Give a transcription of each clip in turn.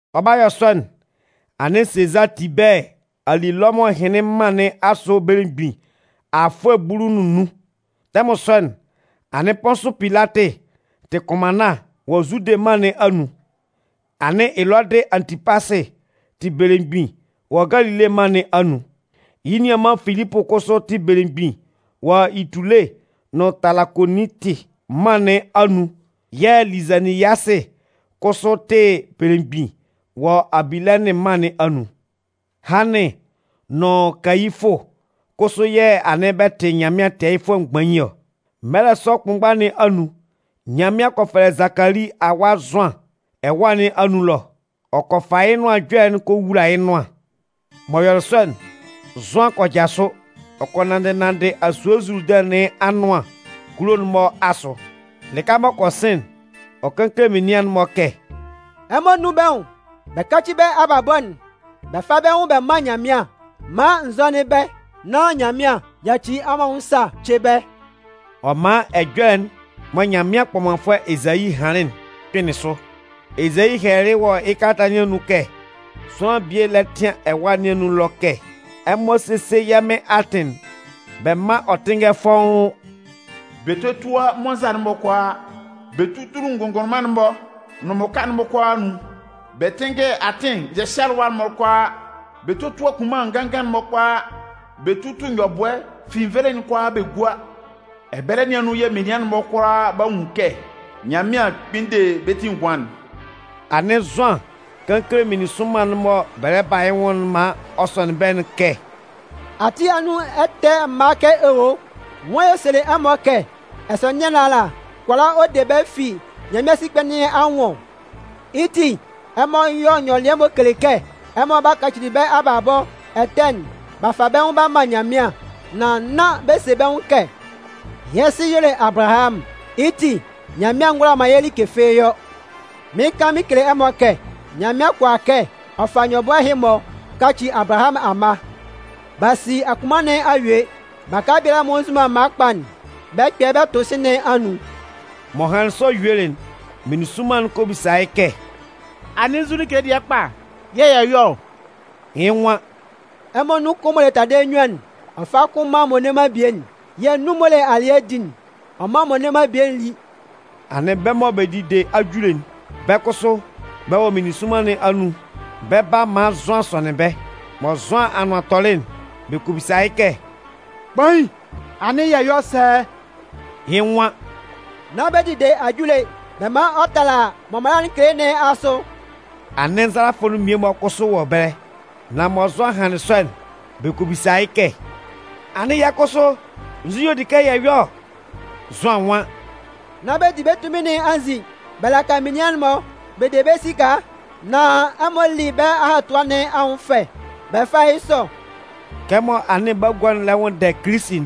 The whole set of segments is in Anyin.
Ɔ 'ba yɔ sɔ'n, anɩn Sezaa Tibɛɛ a li Lɔmʋn ɛhɩnlɩn mân nɩn asʋ belemgbin afʋɛ bulu nʋn nnun. Tɛmʋn sɔ'n, anɩn Pʋnsʋ Pilatɩ tɩ kʋnmanna wɔ Zude mân nɩn anun. Anɩn Elɔdɩ Antipasɩ tɩ belemgbin wɔ Galile mân nɩn anun. Yɩ́ nianman Filipʋ kʋsʋ tɩ belemgbin wɔ Itule nʋn Talakonitɩ mân nɩn anun yɛ̂ Lizaniyasɩ kʋsʋ tɩ belemgbin wɔ Abilɛnɩn mân nɩn anun. Hannɩn nʋn Kayifʋ kʋsʋ yɛ̂ anɩn bɛ tɩ Nyanmɩan Tɛɛyɩfʋɛ mgbain ɔ. Mɛlɛ sɔ kʋnmgba nɩn anun, Nyanmɩan kɔ fɛlɛ Zakali awa Zʋan ɛwa nɩn anun ɛlɔ. Ɔ kɔ fa yɩ́ Nʋan Ɛjɔlɛ'n ɔ kɔ wula yɩ́ nʋan. M'ɔ yɔlɩ sɔ'n, Zʋan kɔ jasʋ, ɔ kɔ nanndɩ nanndɩ asue Zuludɩn nɩn anʋan kulo'n-mɔ asʋ. Lɩka m'ɔ kɔ sɩn'n, ɔ kan kele menian'n-mɔ kɛ: “Ɛmɔ nʋn bɛ́ nwʋn bɛ káci bɛ́ abalabɔ'n bɛ fá bɛ́ nwʋn bɛ mán Nyanmɩan maan n zɔ́nɩn bɛ́, nán Nyanmɩan 'yaci ɛmɔ anwʋn sa ce bɛ́.” Ɔ man ɛjɔlɛ'n mɔ Nyanmɩan kpɔmanfʋɛ Ezayi hanlɩn'n kpɩnlɩn sʋ. Ezayi hɛlɛlɩ wɔ yɩ́ kalata nɩn anun kɛ: Sʋanlan bie lɛ tɩan ɛwâ nɩn anun ɛlɔ kɛ: Ɛmɔ sésie yɛ́ Mɩn atɩn'n, bɛ mán ɔ tɩ́nngɛ fɔ́ʋ́n! Bɛ tótua mmɔnza'n-mɔ kʋalaa bɛ tútulu kʋnngʋnlʋnman'n-mɔ nʋn mmʋka'n-mɔ kʋalaa anun bɛ tɩ́nngɛ atɩn hyɛhyɩalɩwa'n-mɔ kʋalaa bɛ tótua kunman nganngan'n kʋalaa nán bɛ tútu nyɔbʋɛ finnvelein'n kʋalaa bɛ gúa Ɛbɛlɛ nɩn anun yɛ̂ menian'n-mɔ kʋalaa 'ba nwun kɛ Nyanmɩan kpɩn de bɛ́ ti ngʋan'n. Anɩn Zʋan kan kele meninsʋnman'n mɔ bɛ lɛ ba yɩ́ nwʋn maan ɔ sɔnɩn bɛ́'n kɛ: “Ati anun ɛtɛ mma kɛ owo! Nwan y'ɔ selɩ ɛmɔ kɛ ɛsɔnɩan nɩn ala kʋala ɔ de bɛ́ fi Nyanmɩan sikpɛ nɩn anwʋn ɔ? Yɩ́ ti, ɛmɔ yɔ́ nyɔlɩɛ m'ɔ kele kɛ ɛmɔ a kaci bɛ́ abalabɔ ɛtɛ'n b'a fa bɛ́ nwʋn b'a man Nyanmɩan. Nan nán bɛ se bɛ́ nwʋn kɛ: ‘Yɛ́ sɩ y'ɔ le Abalahamʋn, yɩ́ ti Nyanmɩan ngʋala man yɛ́ like fɩ́ɩ́ yɔ.’ Mɩɩn kan mɩn kele ɛmɔ kɛ, Nyanmɩan kʋala kɛ ɔ fa nyɔbʋɛ ɛhɩ-mɔ kaci Abalahamʋn amma. B'a si akunman nɩn a yue. Baka biala m'ɔ nzu man mma kpa'n, bɛ 'kpɛ yɩ́ bʋ bɛ tʋ sɩ̂n nɩn anun.” M'ɔ hanlɩn sɔ yuelɩ'n, meninsʋnman'n kɔ bisa yɩ́ kɛ: “Anɩn nzu like dɩɛ kpa yɛ̂ yɛ yɔ́ ɔ?” Yɩ́ nwan: “Ɛmɔ anun kʋn m'ɔ le taladɩɛ nnyuan'n, ɔ fá kʋn mán m'ɔ le man bie'n, yɛ̂ nun m'ɔ le alɩɛ di'n, ɔ mán m'ɔ le man bie'n lí.” Anɩn bɛ́ mɔ bɛ dide ajule'n, bɛ́ kʋsʋ, bɛ wɔ meninsʋnman nɩn anun, bɛ 'ba maan Zʋan sɔnɩn bɛ́. Mɔ Zʋan anʋan tɔlɩ'n, bɛ kɔ bisa yɩ́ kɛ: “Kpain, anɩn yɛ 'yɔ sɛ?” Yɩ́ nwan: “Nán bɛ dide ajule'n bɛ man ɔ tala mɔ mala'n kele nɩn asʋ.” Anɩn nzalafʋ mmie-mɔ kʋsʋ wɔ ɛbɛlɛ. Nan mɔ Zʋan hanlɩn sɔ'n, bɛ kɔ bisa yɩ́ kɛ: “Anɩn yɛ́ kʋsʋ, nzu yɛ̂ ɔ di kɛ yɛ yɔ́ ɔ?” Zʋan nwan: “Nán bɛ di bɛ́ tunmin nɩn anzin bɛ laka menian'n-mɔ bɛ de bɛ́ esika, nan ɛmɔ lí bɛ́ ahatua nɩn anwʋn fɛ bɛ fá yɩ́ sɔ.” Kɛmɔ anɩn bagua'n lɛ nwʋnndɛ Kilisi'n,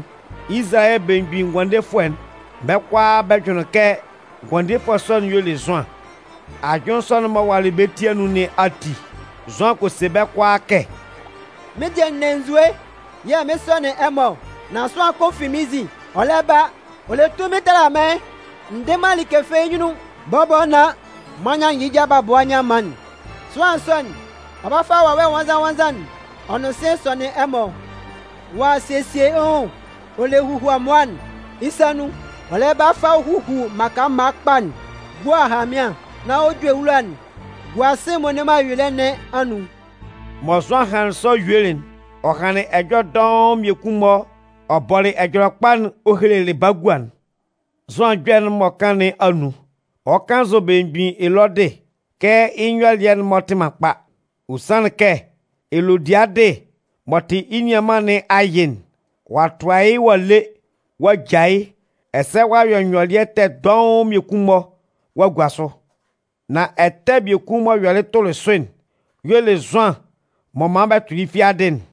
Izalayɛ Belemgbin Ngʋandefʋɛ'n, bɛ́ kʋalaa bɛ jʋnlɩn kɛ Ngʋandefʋɛ sɔ'n y'ɔ le Zʋan. Ajʋnlɩn sɔ'n m'ɔ walɩ bɛ́ ti anun nɩn ati, Zʋan kɔ se bɛ́ kʋalaa kɛ: “Mɩ́n dɩɛ n ne nzue yɛ̂ mɩn sɔnɩn ɛmɔ ɔ, nan sʋanlan kʋn m'ɔ fi mɩ́n nzin ɔ lɛ ba'n, ɔ le tunmin tala mɩ́n. N dɩ man like fɩ́ɩ́ yɩ́ nyunnun bɔbɔ nán m'an nyannjɩ yɩ́ ja mgbabʋa nyanman'n. Sʋanlan sɔ'n, ɔ 'ba fa Wawɛ Nwannzan-nwannzan'n ɔ nʋn sɩ̂n ɔ sɔnɩn ɛmɔ. Ɔ'a sesie yɩ́ nwʋn ɔ le huhuamʋa'n yɩ́ sa nun, ɔ lɛ ba fa huhu mmaka mma kpa'n gua ahanmɩan, nán ɔ ju ewula'n gua sɩ̂n'n m'ɔ le man ayuelɩɛ nɩn anun.” Mɔ Zʋan hanlɩn sɔ yuelɩ'n, ɔ hanlɩn ɛjɔlɛ dɔʋn mmiekun-mɔ ɔ bɔlɩ Ɛjɔlɛkpa'n ɔ helelɩ bagua'n. Zʋan ɛjɔlɛ'n m'ɔ kan nɩn anun, ɔ kannzʋ belemgbin Elɔdɩ kɛ yɩ́ nyɔlɩɛ'n-mɔ tɩ man kpa. Ɔ sanlɩn kɛ Elodiadɩ m'ɔ tɩ yɩ́ nianman nɩn ayɩ'n, ɔ'a tʋa yɩ́ ɔ'a le ɔ'a ja, ɛsɛ ɔ'a yɔ nyɔlɩɛ ɛtɛ dɔʋn mmiekun-mɔ ɔ'a gua sʋ. Nan ɛtɛ kʋn biekun m'ɔ yɔlɩ tʋlɩ sʋ'n, y'ɔ le Zʋan m'ɔ man bɛ tʋlɩ yɩ́ fiadɩ'n.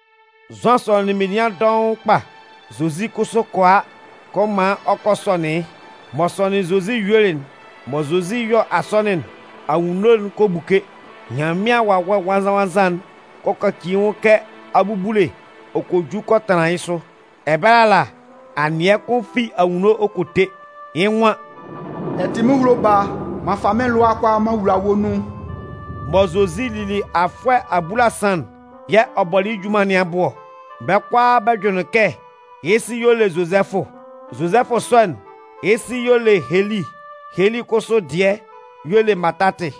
Zʋan sɔnɩnlɩn menian dɔʋn kpa, Zozi kʋsʋ kɔ a kɔ man ɔ kɔ sɔnɩn yɩ́. M'ɔ sɔnɩnlɩn Zozi yuelɩ'n, mɔ Zozi 'yɔ asɔnɩn'n, anwunno'n kɔ buke, Nyanmɩan Wawɛ Nwannzan-nwannzan'n kɔ kaci yɩ́ nwʋn kɛ abubule ɔ kɔ ju kɔ tanlan yɩ́ sʋ. Ɛbɛlɛ ala, anɩɛ kʋn fi anwunno ɔ kɔ te. Yɩ́ nwan: “Ɛ tɩ mɩ́n ehulo Baa. M'an fa mɩ́n lʋa'n kʋalaa m'an wula wɔ́ nun.” Mɔ Zozi lili kɔ yɔ afʋɛ abulasan'n yɛ̂ ɔ bɔlɩ yɩ́ junman nɩn abʋ ɔ. Bɛ́ kʋalaa bɛ jʋnlɩn kɛ yɩ́ sɩ y'ɔ le Zozɛfʋ. Zozɛfʋ sɔ'n, yɩ́ sɩ y'ɔ le Heli. Heli kʋsʋ dɩɛ y'ɔ le Matatɩ.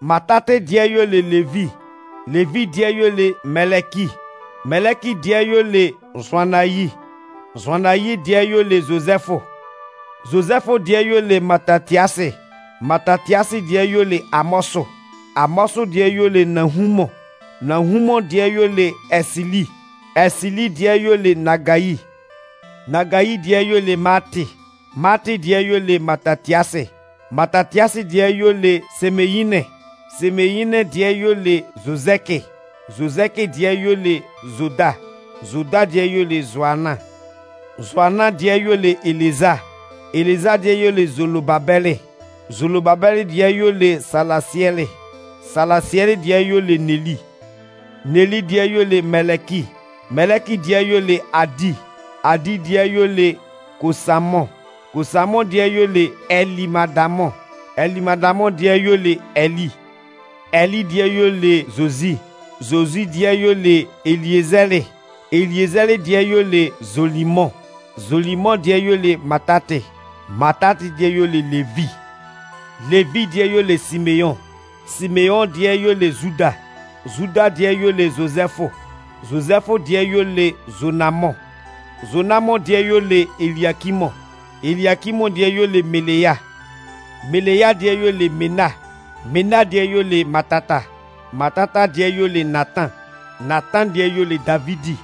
Matatɩ dɩɛ y'ɔ le Levi. Levi dɩɛ y'ɔ le Mɛlɛki. Mɛlɛki dɩɛ y'ɔ le Zʋannayi. Zʋannayi dɩɛ y'ɔ le Zozɛfʋ. Zozɛfʋ dɩɛ y'ɔ le Matatiasɩ. Matatiasɩ dɩɛ y'ɔ le Amɔsʋ. Amɔsʋ dɩɛ y'ɔ le Nahumʋn. Nahumʋn dɩɛ y'ɔ le Ɛsɩli. Ɛsɩli dɩɛ y'ɔ le Nagayi. Nagayi dɩɛ y'ɔ le Maatɩ. Maatɩ dɩɛ y'ɔ le Matatiasɩ. Matatiasɩ dɩɛ y'ɔ le Semeyinɩn. Semeyinɩn dɩɛ y'ɔ le Zozɛkɩ. Zozɛkɩ dɩɛ y'ɔ le Zoda. Zoda dɩɛ y'ɔ le Zoanan. Zoanan dɩɛ y'ɔ le Eleza. Eleza dɩɛ y'ɔ le Zolobabɛlɩ. Zolobabɛlɩ dɩɛ y'ɔ le Salasiɛlɩ. Salasiɛlɩ dɩɛ y'ɔ le Neli. Neli dɩɛ y'ɔ le Mɛlɛki. Mɛlɛki dɩɛ y'ɔ le Adi. Adi dɩɛ y'ɔ le Kosamʋn. Kosamʋn dɩɛ y'ɔ le Ɛlɩmadamʋn. Ɛlɩmadamʋn dɩɛ y'ɔ le Ɛlɩ. Ɛlɩ dɩɛ y'ɔ le Zozi. Zozi dɩɛ y'ɔ le Eliezɛlɩ. Eliezɛlɩ dɩɛ y'ɔ le Zolimʋn. Zolimʋn dɩɛ y'ɔ le Matatɩ. Matatɩ dɩɛ y'ɔ le Levi. Levi dɩɛ y'ɔ le Simeʋn. Simeʋn dɩɛ y'ɔ le Zuda. Zuda dɩɛ y'ɔ le Zozɛfʋ. Zozɛfʋ dɩɛ y'ɔ le Zonamʋn. Zonamʋn dɩɛ y'ɔ le Eliakimʋn. Eliakimʋn dɩɛ y'ɔ le Melea. Melea dɩɛ y'ɔ le Mena. Mena dɩɛ y'ɔ le Matata. Matata dɩɛ y'ɔ le Natan. Natan dɩɛ y'ɔ le Davidi.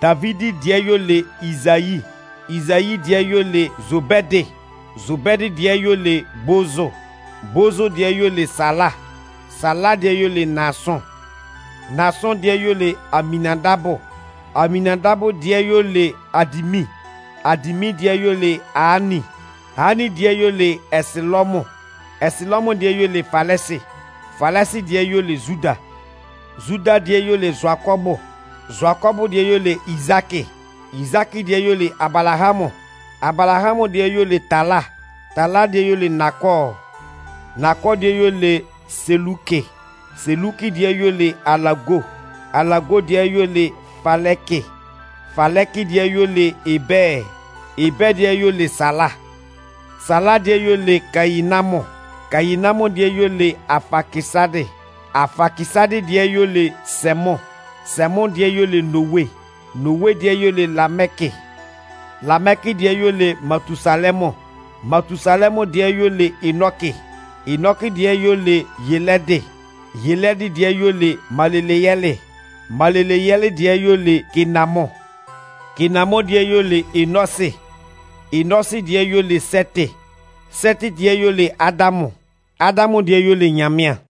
Davidi dɩɛ y'ɔ le Izayi. Izayi dɩɛ y'ɔ le Zobɛdɩ. Zobɛdɩ dɩɛ y'ɔ le Bozʋ. Bozʋ dɩɛ y'ɔ le Sala. Sala dɩɛ y'ɔ le Naasʋn. Naasʋn dɩɛ y'ɔ le Aminnandabʋ. Aminnandabʋ dɩɛ y'ɔ le Adimin. Adimin dɩɛ y'ɔ le Aani. Aani dɩɛ y'ɔ le Ɛsɩlɔmʋn. Ɛsɩlɔmʋn dɩɛ y'ɔ le Falɛsɩ. Falɛsɩ dɩɛ y'ɔ le Zuda. Zuda dɩɛ y'ɔ le Zʋakɔbʋ. Zʋakɔbʋ dɩɛ y'ɔ le Izaakɩ. Izaakɩ dɩɛ y'ɔ le Abalahamʋn. Abalahamʋn dɩɛ y'ɔ le Tala. Tala dɩɛ y'ɔ le Nakɔɔ. Nakɔɔ dɩɛ y'ɔ le Selukɩ. Selukɩ dɩɛ y'ɔ le Alago. Alago dɩɛ y'ɔ le Falɛkɩ. Falɛkɩ dɩɛ y'ɔ le Ebɛɛ. Ebɛɛ dɩɛ y'ɔ le Sala. Sala dɩɛ y'ɔ lɛ Kayinamʋn. Kayinamʋn dɩɛ y'ɔ le Afakɩsadɩ. Afakɩsadɩ dɩɛ y'ɔ le Sɛmʋn. Sɛmʋn dɩɛ y'ɔ le Nowe. Nowe dɩɛ y'ɔ le Lamɛkɩ. Lamɛkɩ dɩɛ y'ɛ le Matusalɛmʋn. Matusalɛmʋn dɩɛ y'ɔ le Enɔkɩ. Enɔkɩ dɩɛ y'ɔ le Yelɛdɩ. Yelɛdɩ dɩɛ y'ɔ le Maleleyɛlɩ. Maleleyɛlɩ dɩɛ y'ɔ le Kenamʋn. Kenamʋn dɩɛ y'ɔ le Enɔsɩ. Enɔsɩ dɩɛ y'ɛ le Sɛtɩ. Sɛtɩ dɩɛ y'ɔ le Adamʋn. Adamʋn dɩɛ y'ɔ le Nyanmɩan.